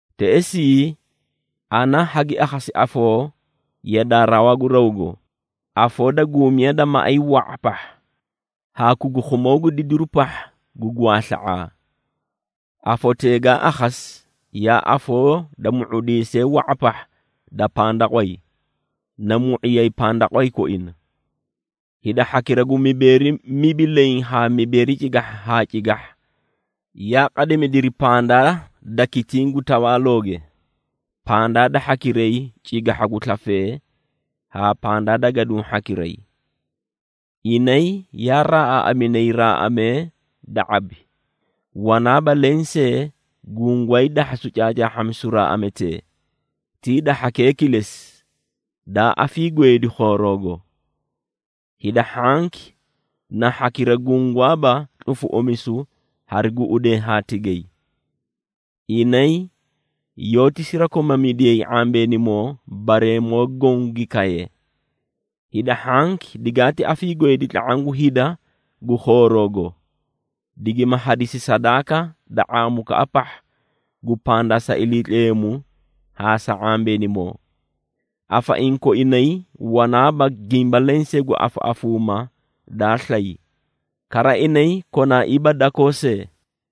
Teꞌesii, ana hagi akhasi afoo yadaa rawaa gu rawgo, afoo da guumiya da maꞌay wa⁄a pahha, haa kukukhumoo gu didiru pahha gu gwaasla⁄aa. Afotee gaa akhasi, yaa afoo da mu⁄udiisee wa⁄a pahha da pandaqway, na mu⁄iyay pandaqway koina. Hida hhakira gu mibeeri mibi leẽ haa mibeeri cigahha haa cigahha, yaa qadimidiri pandaa da kitiĩ gu tawaalooge, pandaa da hhakiray cigahha gu slafee haa pandaa da gaduũ hhakiray. Inay yaa raaꞌaaꞌaminay raaꞌamee da ⁄abi, wanaaba lensee gungwaay dahhasu caacaahhamisu raaꞌametee, ti hida hhakee kilesi, daa afiigweedi khooroogo. Hida hhanki na hhakira gungwaaba tlufuꞌumisu hari guꞌudee haa tigay. Inay yoóti sirakomamidiyay ⁄ambeenimoo bareemoo goõ gi kaye. Hida hhanki digaati afiigweedi tla⁄aã gu hida gu khooroogo, digima hadisi sadaaka da ⁄aamukaꞌa pahha gu pandaa sa Iliitleemu haa sa ⁄ambeenimoo. Afaiĩ koinay wanaaba gimba lensee gu afaꞌafuumaa daa slay, kara inay konaaiiba dakoo see.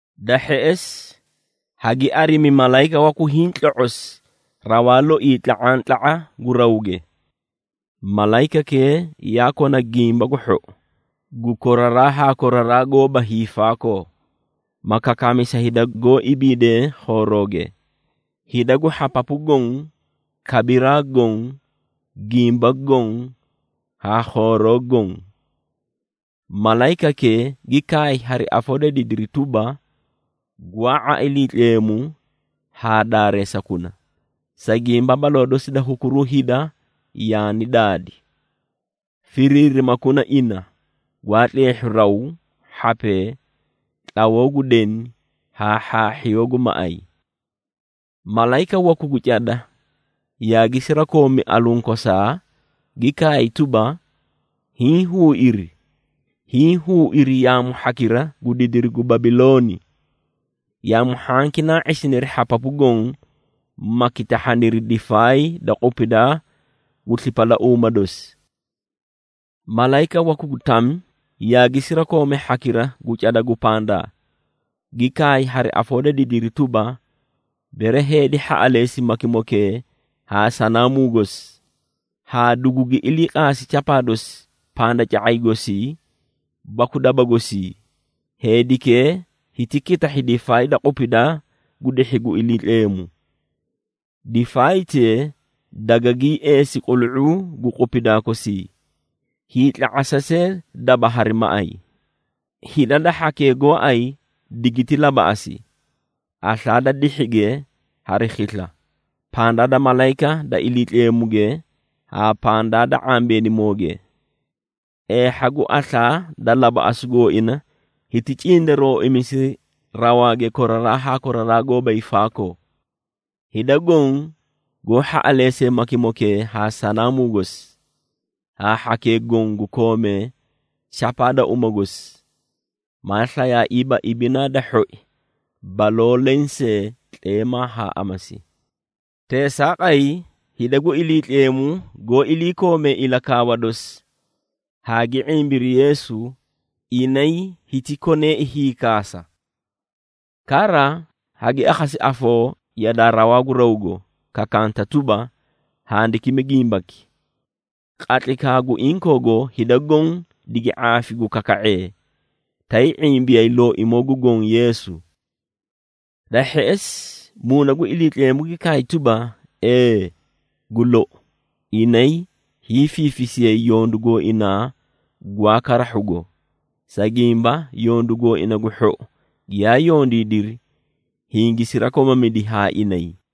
Da hheꞌesi, hagi arimi malayika waku hiĩ tloꞌosi rawaa loii tla⁄antla⁄a gu rawge. Malayikakee yaa kona Gimba gu Hhou, gu koraraa haa koraraa goóba hiifaakoo, ma kakaami sa hida goó ibiidee khoorooge, hida gu hhapapu goõ, kabiraa goõ, gimba goõ haa khooroo goõ. Malayikakee gi kaay hari afoo da didiri tuba, “Gwaa⁄a Iliitleemu haa daareesakuna, sa gimba baloo dosi da hukuruu hida yaani daadi. Firiirimakuna ina gwaa tleehhu raw, hhapee, tlawoo gu deni haa hhaahhiyoo gu maꞌay.” Malayika waku gu cada yaagi sirakoomi alunkosaa, gi kaay tuba, “Hiĩ huuiri! Hiĩ huuiri yaamu hhakira gu didiri gu Babilooni. Yaamu hhanki naa ⁄isiniri hhapapu goõ, ma kitahhaniri difaay da qupidaa gu slipalauuma dosi.” Malayika waku gu tami yaagi sirakoomi hhakira gu cada gu pandaa, gi kaay hari afoo da didiri tuba, “Bere heedi hhaꞌaleesi makimokee haa sanaamuu gosi, haa dugugi iliiqaasi chapaa dosi pandaca⁄ay gosii baku daba gosii, heedikee hiti kitahhi difaay da qupidaa gu dihhi gu Iliitleemu. Difaaytee dagangii eesi qulu⁄uu gu qupidaa kosii, hiitla⁄asa see daba hari maꞌay. Hida da hhakee gooay digiti labaꞌasi, aslaa da dihhige hari khisla, pandaa da malayika da Iliitleemuge haa pandaa da ⁄ambeenimooge. Eehha gu aslaa da labaꞌasu gooina, hiti cindarooimisi rawaage koraraa haa koraraa goóba hiifaakoo. Hida goõ goó hhaꞌaleesee makimokee haa sanaamuu gosi, haa hhakee goõ gu koomee chapaa da uma gosi, maa slayaaiiba ibinaa da hhoi baloo leẽ see tleemaa haa amasi.” Teesaaqay, hida gu Iliitleemu goó iliikoomee ilakaawa dosi, haa gi ⁄imbiri Yeesu, inay hiti koneei hiikaasa. Kara, hagi akhasi afoo yadaa rawaa gu rawgo, kakanta tuba, “Handikimi gimbaki, ‘Qatlaykaa gu inkoogo, hida goõ digi ⁄aafi gu kaka⁄ee, tay ⁄imbiyay Looimoo gu Goõ, Yeesu.’” Da hheꞌesi, Muuna gu Iliitleemu gi kaay tuba, “Ee, gu lou. Inay hiifiifisiyay yondu gooinaa gwaa karahhugo, sa gimba, yondu gooina gu hhou giyaa yondiidiri, hingi sirakomamidi haa inay.”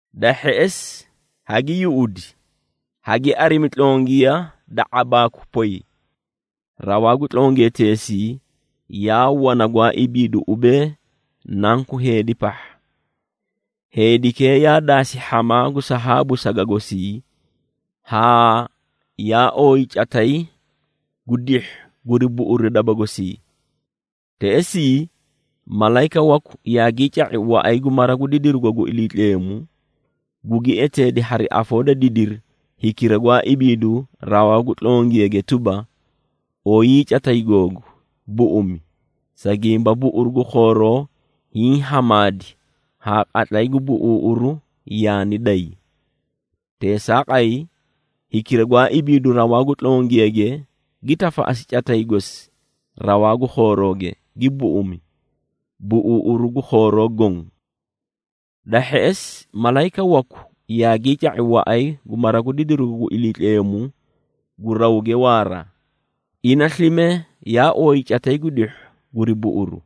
Da hheꞌesi, hagi yuꞌudi haa gi arimi tlongiya da ⁄abaakwi poy. Rawaa gu tlongiyateesii yaa wana gwaa ibiidu ubee, “Nanku Heedi pahha.” Heedikee yaa daasi hhamaa gu sahaabu saga gosii, haa yaa ooyi catay gu dihhu guri buꞌuru daba gosii. Teꞌesii, malayika waku yaagii ca⁄i waꞌay gu mara gu didirugo gu Iliitleemu, gugi eteedi hari afoo da didiri hikira gwaa ibiidu rawaa gu tlongiyage tuba, “Oyii catay googu, buꞌumi, sa gimba buꞌuru gu khooroo hiĩ hamaadi haa qatlay gu buꞌuuꞌuru yaani day.” Teesaaqay, hikira gwaa ibiidu rawaa gu tlongiyage, gi tafaꞌasi catay gosi rawaa gu khoorooge, gi buꞌumi, buꞌuuꞌuru gu khooroo goõ. Da hheꞌesi, malayika waku yaagii ca⁄i waꞌay gu mara gu didirugo gu Iliitleemu gu rawge waara, ina slime yaa ooyi catay gu dihhu guri buꞌuru.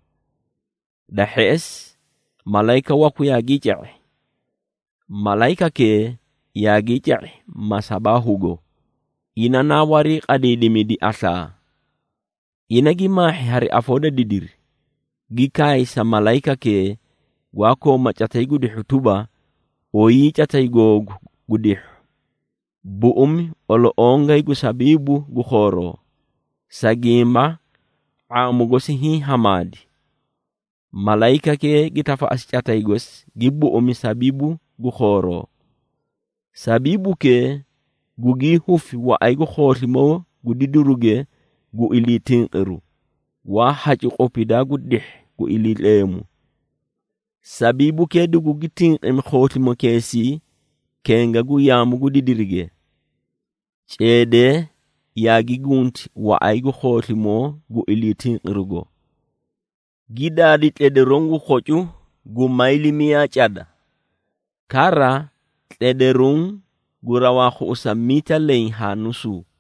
Da hheꞌesi, malayika waku yaagii ca⁄i. Malayikakee yaagii ca⁄i masabaahugo, ina naa wariiqadiidimidi aslaa. Ina gi maahhi hari afoo da didiri, gi kaay sa malayikakee gwaa kooma catay gu dihhu tuba, “Oyii catay googu gu dihhu, buꞌumi oloꞌongay gu sabiibu gu khooroo, sa gimba ⁄aamu gosi hiĩ hamaadi.” Malayikakee gi tafaꞌasi catay gosi, gi buꞌumi sabiibu gu khooroo. Sabiibukee gugii hufi waꞌay gu khooslimoo gu didiruge gu ilii tinqiru, gwaa hacu qupidaa gu dihhi gu Iliitleemu. Sabiibukee dugugi tinqimi khooslimokeesii kenga gu yaamu gu didirige. Ceedee yaagi gunti waꞌay gu khooslimoo gu ilii tinqirugo, gi daadi tledaruũ gu khocu gu mayli miyaa cada. Kara tledaruũ gu rawaa khuꞌusa miita leẽ haa nusuu.